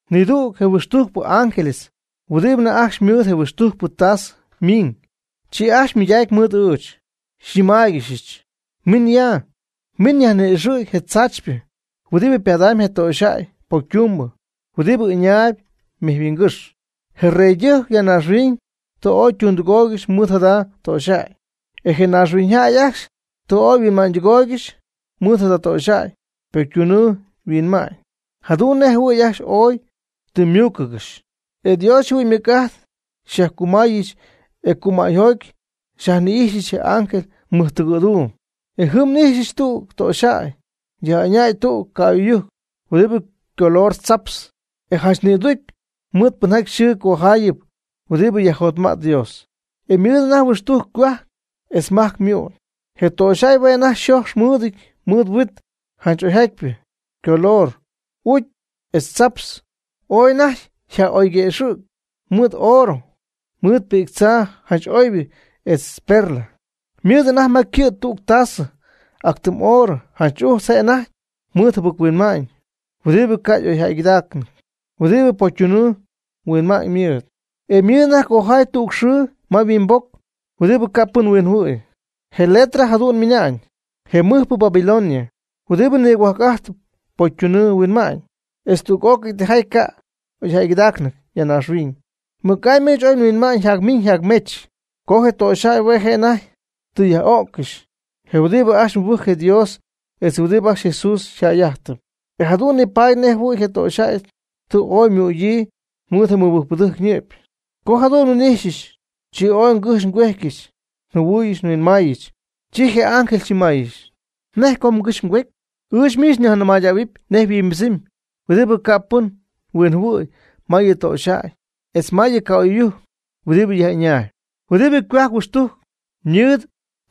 Nidüg je huixtujcpɨ ángeles huɨdibɨ anajty ajcxy mɨɨd je huixtujcpɨ ytasɨ ymiiñ. Chi ajcxy ymɨydacy mɨɨd ɨɨch, xyñɨmaaygɨxɨch: ―Min yam, miiñ nyajni'ixɨ̈y je tzaachypɨ huɨdibɨ ypadamyb je töxyjäy pocytumbɨ, huɨdibɨ ɨñaayb mejyhuingɨ́xy. Je reydɨjc ya naaxhuiñ tɨ ooy ytundɨgooygɨxy mɨɨd jada töxyjäy, e je naaxhuiñyjäy ajcxy tɨ ooy huinma'ñydɨgooygɨxy mɨɨd jada töxyjäy ypocytunɨɨ huinma'ñ, jadu'n nej jɨhuɨ̈y ajcxy ooy tɨ ymúucɨgɨxy. E Dios yjɨhuɨ'ñ ymɨc'ajt xyajcumäyɨch e cumäyjoty xyajnɨcxyɨch je ángel mɨjtɨgɨ̈duum. E jɨm n'ijxyɨch tüg töxyjäy yaj'ɨñäy tüg ca'oy'ɨyujc huɨdibɨ ycolor tzaptz, e janch nïducy mɨɨd pɨnjaty yxɨɨ cojaayɨp huɨdibɨ yajjotma'tp Dios, e ymɨɨd anajty huixtujc ycohuajc etz majc ymu'n. Je töxyjäy hue' anajty yxojx mɨɨdɨty mɨɨd huit janch oyjatypɨ, ycolor ucy etz tzaptz, ooy anajty yaj'oyguëxɨ̈gy mɨɨd oorɨ, mɨɨd pi'ctzaa janch oybɨ etz perla. Ymɨɨd anajty ma ycɨ' tüg tasɨ ac tɨm oorɨ janch ujtz je' anajty mɨɨd jɨbɨc-huinma'ñ huɨdibɨ ca' y'oyjäygɨdaacnɨty, huɨdibɨ pocytunɨɨ huinma'ñ mɨɨd. E ymɨɨd anajty cojaay tüg xɨɨ ma yhuimboc huɨdibɨ ca' pɨn huinjɨhuɨ̈y. Je letra jadu'n ymɨna'ñ: “Je mɨjpɨ Babilonia, huɨdibɨ nigop'ajtɨp pocytunɨɨ huinma'ñ etz tüg'ócɨy tijaty ca' y'oyjäygɨdaacnɨty ya naaxhuiñ.” Mɨc'amy ɨɨch oy nhuinma'ñ nyajmiñ nyajmech co je töxyjäy hue' je' anajty tɨ yaj'o'ccɨxy je huɨdibɨ ajcxy mɨbɨjcp Dios etz huɨdibɨ ajcxy Jesús yjäy'ajtɨp, e jadu'n nipaady nej jɨhuɨ̈y je töxyjäy tɨ ooy ymügyii mɨɨd je mɨbɨjcpɨdɨjc ñɨ'py. Co jadu'n nhuin'ijxyɨch, chi ooy ngɨjxy ngüejtyɨch njɨhuɨy nhuinmaayɨch. Chi je ángel xyñɨmaayɨch: ―¿Nej co mgɨxy mgüety? Ɨɨch miich nyajnɨmähuɨpy nej yhuimbɨdzɨmy huɨdibɨ ca' pɨn huinjɨhuɨ̈y ma yɨ töxyjäy etz ma yɨ ca'oy'ɨyujc huɨdibɨ yaj'ɨñaayb, huɨdibɨ ycohuajc huixtujc mɨɨd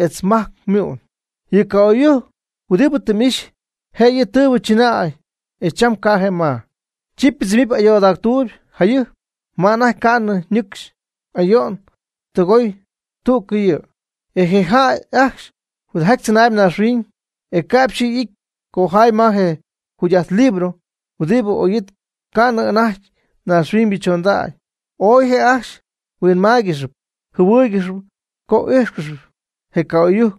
etz majc ymu'n. Yɨ ca'oy'ɨyujc huɨdibɨ tɨ m'ixy, je' yɨ' tɨɨbɨ chɨnäy e cham ca'p je' ma. Chi ypɨdzɨmɨpy ayoodactuuyb, jayɨjp ma anajty ca'nɨ nɨcxy y'ayoy ytɨgoy tüccɨ'yɨ. E je jäy ajcxy huɨdijaty tzɨnaayb naaxhuiñ, e ca'p yxɨɨ y'ity cojaay ma je jugy'ajt libro huɨdibɨ oyɨɨy ca'nɨ anajty naaxhuiñybɨ chondägy. Ooy je' ajcxy huinmáaygɨxɨpy jɨhuɨ́ɨygɨxɨpy co íjxcɨxɨpy je ca'oy'ɨyujc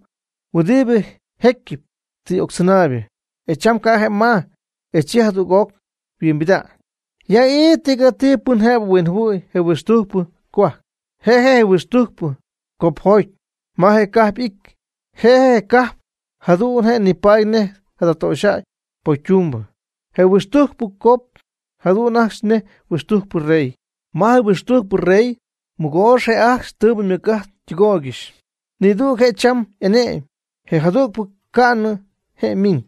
huɨdibɨ jecyɨp tɨ y'octzɨnaaybɨ, e cham ca' je' ma, e chi jada' jadüg'oc yhuimbida'ñ. Ya ii tigati pɨn jëbɨ huinjɨhuɨ̈y je huixtujcpɨ cohuajc, je' je' je huixtujcpɨ copjot ma je cajp y'ity. E je cajp jadu'n je' nipaady nej jada töxyjäy pocytumbɨ. Je huixtujcpɨ cop jadu'n ajcxy nej huixtujcpɨ rey. Ma je huixtujcpɨ rey mɨgoox je' ajcxy tɨɨbɨ ymɨc'ajt ytɨgooygɨxy. Nidüg je' cham y'ane'my. Je jadügpɨ ca'nɨ je' ymiiñ.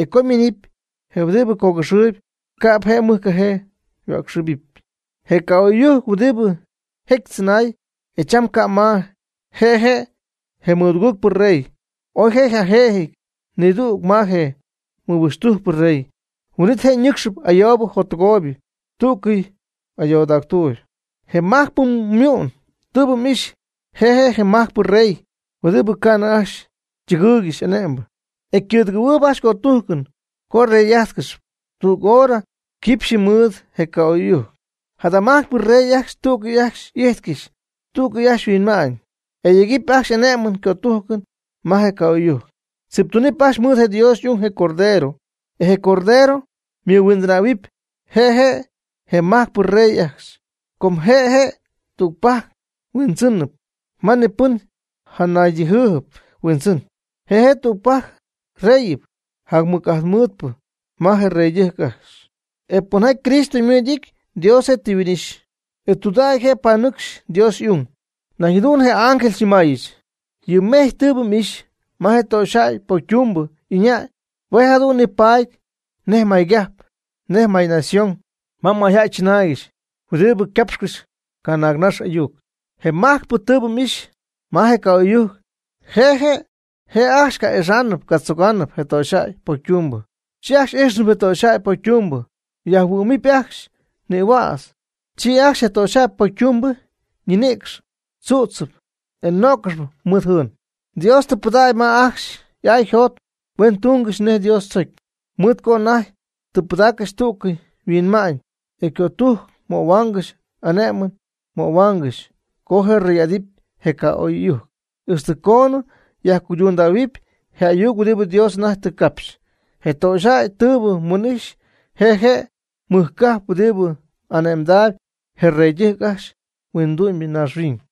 E co je' ymiinɨpy je huɨdibɨ cogɨxɨɨyb, ca'p je' mɨjcajee yhuäcxɨbɨpy. Je ca'oy'ɨyujc huɨdibɨ jecyɨp tzɨnay, e cham ca' ma, je' je' je mɨductujcpɨ rey, oy je' yjajëjɨty nidüg ma je nihuixtujcpɨ rey. Huin'it je' ñɨcxnɨpy ayoobɨ jottɨgooybɨ tüccɨ'yɨ ayoodactuuby. Je majcpɨ mu'n tɨɨbɨ m'ixy, je' je' je majcpɨ rey huɨdibɨ ca'nɨ ajcxy ytɨgɨɨygɨxy ane'mbɨ. E cɨ̈dɨgɨ̈huɨɨb ajcxy ycötujcɨn co yrey'ájtcɨxɨpy tüg hora quipxyɨ mɨɨd je ca'oy'ɨyujc. Jada majcpɨ rey ajcxy tú'cɨy ajcxy y'ijtcɨxy, tú'cɨy ajcxy yhuinma'ñ, e yegɨpy ajcxy y'ane'mɨn ycötujcɨn ma je ca'oy'ɨyujc. Tziptuunɨp ajcxy mɨɨd je Dios y'ung, je Cordero. E je Cordero ymɨmadactähuɨpy je' je majcpɨ rey ajcxy. Com je' je' tügpajc Huindzɨnɨp ma pɨn janaydíjɨp huindzɨn. Je' je' tügpajc reyɨp jac mɨc'ajt mɨɨdpɨ ma je reydɨjc ajcxy. E pɨnjaty Cristo mɨɨd y'ity, Dios je' tɨ huin'ixy, e tudägy je' panɨcxy Dios y'ung. Nañ jadu'n je ángel xyñɨmaayɨch: ―Yɨ mejy tɨɨbɨ m'ixy ma je töxyjäy pocytumbɨ ɨñäy, hue' je' jadu'n nipaady nej maygajp, nej mayñación ma mayjäy chɨnaygɨxy huɨdibɨ capxcɨxp canaagnax ayuc. Je majcpɨ mu'n tɨɨbɨ m'ixy ma je ca'oy'ɨyujc, je' ajcxy ca'ixa'nɨp catzoga'nɨp je töxyjäy pocytumbɨ. Chi ajcxy ix'ijxnɨp je töxyjäy pocytumbɨ, yajhuɨ'mɨpy ajcxy nïhuädz. Chi ajcxy je töxyjäy pocytumbɨ ñinïcx tzu'tzɨpy, e nöccɨxɨpy mɨɨd jɨɨn. Dios tɨ pɨdägy ma ajcxy y'aa yjot huen tungɨxy nej Dios tzocy, mɨɨd co anajty tɨ pɨdaaccɨxy tú'cɨy yhuinma'ñ. E cötujc möhuaangɨxy ane'mɨn möhuaangɨxy co yrey'adɨpy je ca'oy'ɨyujc, ixtɨ coonɨ yajcuydundähuɨpy je ayuc huɨdibɨ Dios anajty tɨ capxy. Je töxyjäy tɨɨbɨ mhuin'ixy, je' je' je mɨj cajp huɨdibɨ ane'mdaayb je reydɨjc ajcxy huindu'myñaaxhuiñ.